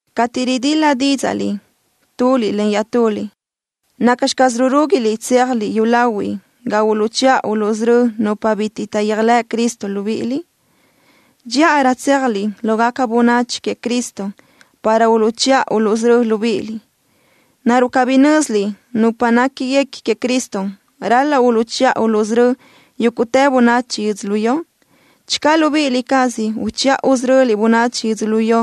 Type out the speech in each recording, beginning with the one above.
Cateʼ ridil-la dídzaʼliʼ tuliʼ len iaʼtuliʼ, ¿nacxi caz rurúguiliʼ tséajliʼ yúlahuiʼ ga uluʼchiʼa uluʼsörö́ nupa bitiʼ taʼyéajlëʼ Cristo libíʼiliʼ? Dxíʼarö tséajliʼ lógaca bönachi queëʼ Cristo para uluʼchiʼa uluʼsörö́ libíʼiliʼ. ¿Naruʼ cabí nö́ziliʼ nupa néquiguequi queëʼ Cristo ral-laʼ uluʼchiʼa uluʼsörö́ yúguʼtë bönachi yödzölió? Channö libíʼi cázaliʼ uchiʼa usöröliʼ bönachi yödzölió,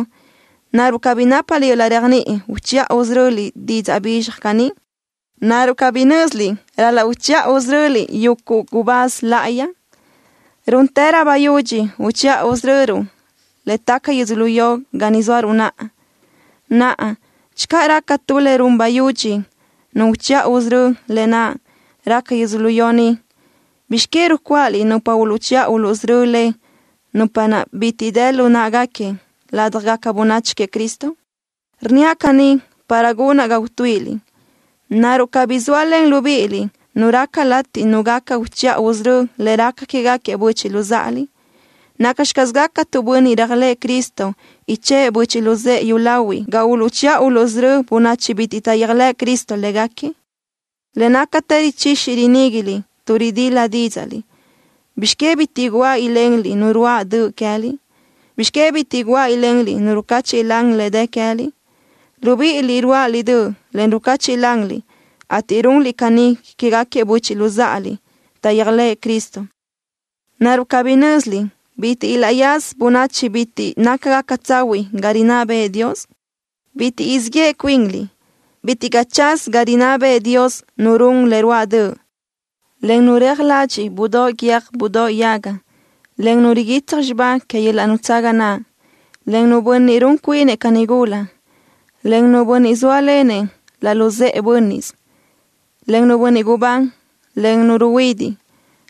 ¿naruʼ cabí nápaliʼ yöl-laʼ réajniʼi uchiʼa usöröliʼ didzaʼ bizxaj caní? ¿Naruʼ cabí nö́ziliʼ ral-laʼ uchiʼa usörö́ruʼ yuguʼ gubáz láʼayi? Rúntërö bayudxi uchiʼa usöröruʼ le taca yödzölió ga ni zóaruʼ naʼa. Naʼa, channö raca tu le run bayudxi nu uchiʼa usörö́, lë naʼ raca yödzölió ni, ¿bizx que rucuáʼaliʼ nupa uluʼchiʼa uluʼsörö́ le, nupa naʼ bitiʼ bi dë lu në́ʼeguequi ládjagaca bönachi queëʼ Cristo? Rnníaʼ caní para gunaʼ ga utuíʼiliʼ. ¿Naruʼ cabí zóalen libíʼiliʼ nu raca latiʼ nu gaca uchiʼa usörö́ le raca quégaquiëʼ böchiʼ luzáʼaliʼ? ¿Nacxi caz gaca tu bönniʼ réajlëʼë Cristo ichë́ʼë böchiʼ luzë́ʼë yúlahuiʼ ga uluʼchiʼa uluʼsörö́ bönachi bitiʼ taʼyéajlëʼ Cristo légaquiëʼ? Le nácatë richixi riníguiliʼ tuʼ ridil-la dídzaʼliʼ. ¿Bizx que bitiʼ guáʼ ilenliʼ nu ruáʼ döʼ queë́liʼ? ¿Bizx que bitiʼ guáʼ ilenliʼ nu rucáchiʼlan le dë queë́liʼ? Libíʼiliʼ ruáʼaliʼ döʼ, en rucachiʼ lanliʼ, ateʼ runliʼ caní quégaquiëʼ böchiʼ luzáʼaliʼ taʼyéajlëʼë Cristo. ¿Naruʼ cabí nö́ziliʼ bitiʼ ilaʼyaza bönachi bitiʼ nácagaca tsahuiʼ ga rinná bëʼë Dios? ¡Bitiʼ siʼ yeʼe cuinliʼ! Bitiʼ caʼ tsaz ga rinná bëʼë Dios nu run le ruáʼ döʼ: Cuntu nu reaj ladxiʼ budóʼ guiö́j budóʼ yaga, en cuntu nu riguitsaj xibá que yöl-laʼ nutsaga naʼ, en cuntu nu bönniʼ run cuinëʼ ca nigula, en cuntu nu bönniʼ zóalenëʼ laʼ luzë́ʼe bö́nniʼsëʼ, en cuntu nu bönniʼ gubán, en cuntu nu ruhuidiʼ,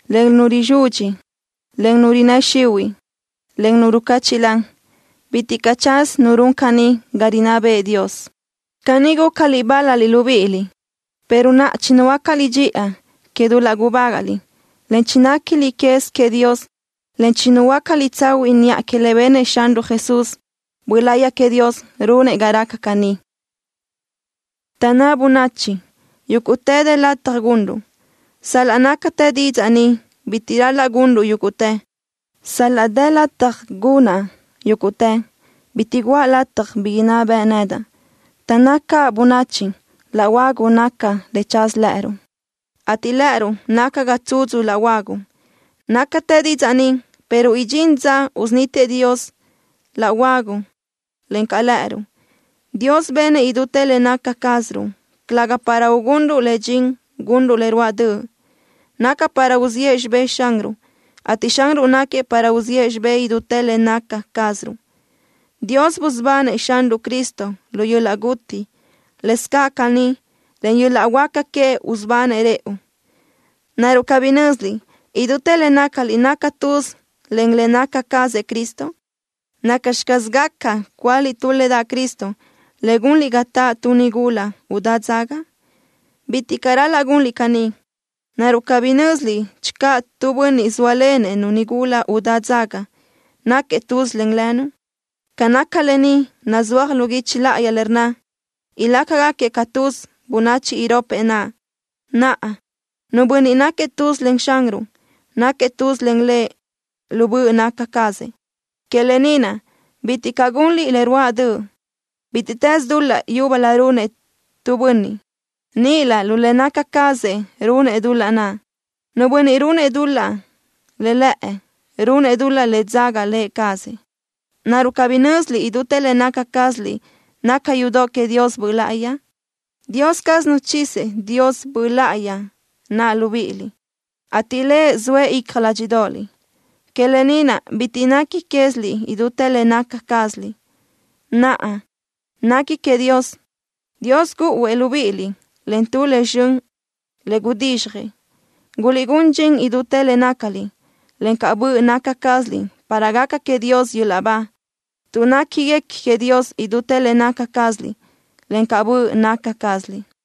en cuntu nu rizudxi, en cuntu nu rinnë́ xihuiʼ, en cuntu nu rucáchiʼlan. Bitiʼ caʼ tsaz nu run caní ga rinná bëʼë Dios. Caní gúcaliʼ bál-laliʼ libíʼiliʼ, pero naʼa chinuhuöácaliʼ dxiʼa que dul-laʼ gubágaʼliʼ, en chinéquiliʼ quez queëʼ Dios, en chinuhuöácaliʼ tsahuiʼ niʼa que le benëʼ Xanruʼ Jesús. Böʼ Láʼayi queëʼ Dios runëʼ ga raca caní. Taʼnná bönachi: “Yúguʼtë dë lataj gunruʼ.” Sal-laʼ nácatë didzaʼ ni, bitiʼ ral-laʼ gunruʼ yúguʼtë. Sal-laʼ dë lataj gunaʼ yúguʼtë, bitiʼ guʼa lataj bi inná beʼe nedaʼ. Taʼnná caʼ bönachi: “Laʼ huagu naca le tsaz lë́ʼëruʼ, ateʼ lë́ʼëruʼ naca ga tsudzu laʼ huagu.” Nácatë didzaʼ ni, pero idxín dza usunítiëʼ Dios laʼ huagu, encaʼ lë́ʼëruʼ. Dios benëʼ idútë le naca cázaruʼ, calëga para ugunruʼ le dxin gunruʼ le ruáʼ döʼ. Naca para uziʼë xibé Xanruʼ, ateʼ Xanruʼ náquiëʼ para uzíʼ xibë́ʼ idútë le naca cázaruʼ. Dios busubanëʼ Xanruʼ Cristo lu yöl-laʼ guti. Lëscaʼ caní, len yöl-laʼ huáca queëʼ usubanëʼ rëʼu. ¿Naruʼ cabí nö́ziliʼ, idútë le nácaliʼ naca tuz len le naca cazëʼ Cristo? ¿Nacxi caz gaca cúaliʼ tu le daʼ Cristo, en gunliʼ ga taʼ tu nigula udá dzaga? ¡Bitiʼ caʼ ral-laʼ gunliʼ caní! ¿Naruʼ cabí nö́ziliʼ channö tu bönniʼ zóalenëʼ-nu nigula udá dzaga, náquiëʼ tuz len lënu? Ca naca lë ni nazúaj lu guichi láʼayi le rnna: “Ilácagaquiëʼ ca tuz bönachi iropëʼ naʼ.” Naʼa, nu bönniʼ náquiëʼ tuz len Xanruʼ, náquiëʼ tuz len Lëʼ lu böʼ naca cazëʼ. Que lë ni naʼ, bitiʼ caʼ gunliʼ le ruáʼ döʼ. Bítiʼtës dul-laʼ yúbölö runëʼ tu bönniʼ, níʼilö lu le naca cazëʼ runëʼ dul-laʼ naʼ. Nu bönniʼ runëʼ dul-laʼ le lëʼë, runëʼ dul-laʼ le dzaga lë cazëʼ. ¿Naruʼ cabí nö́ziliʼ idútë le naca cázaliʼ naca yudoʼ queëʼ Dios Böʼ Láʼayi? Dios caz nuchizëʼ Dios Böʼ Láʼayi naʼ libíʼiliʼ, ateʼ Lëʼ zoëʼ icja ládxiʼdoʼoliʼ. Que lë ni naʼ bitiʼ nequi queë́ziliʼ idútë le naca cázaliʼ. Naʼa, nequi queëʼ Dios. Dios gúʼuëʼ libíʼiliʼ len tu le zxön le gudizxjëʼ. Guliʼgún dxin idútë le nácaliʼ, encaʼ böʼ naca cázaliʼ para gaca queëʼ Dios yöl-laʼ ba, tuʼ néquiguequi queëʼ Dios idútë le naca cázaliʼ, encaʼ böʼ naca cázaliʼ.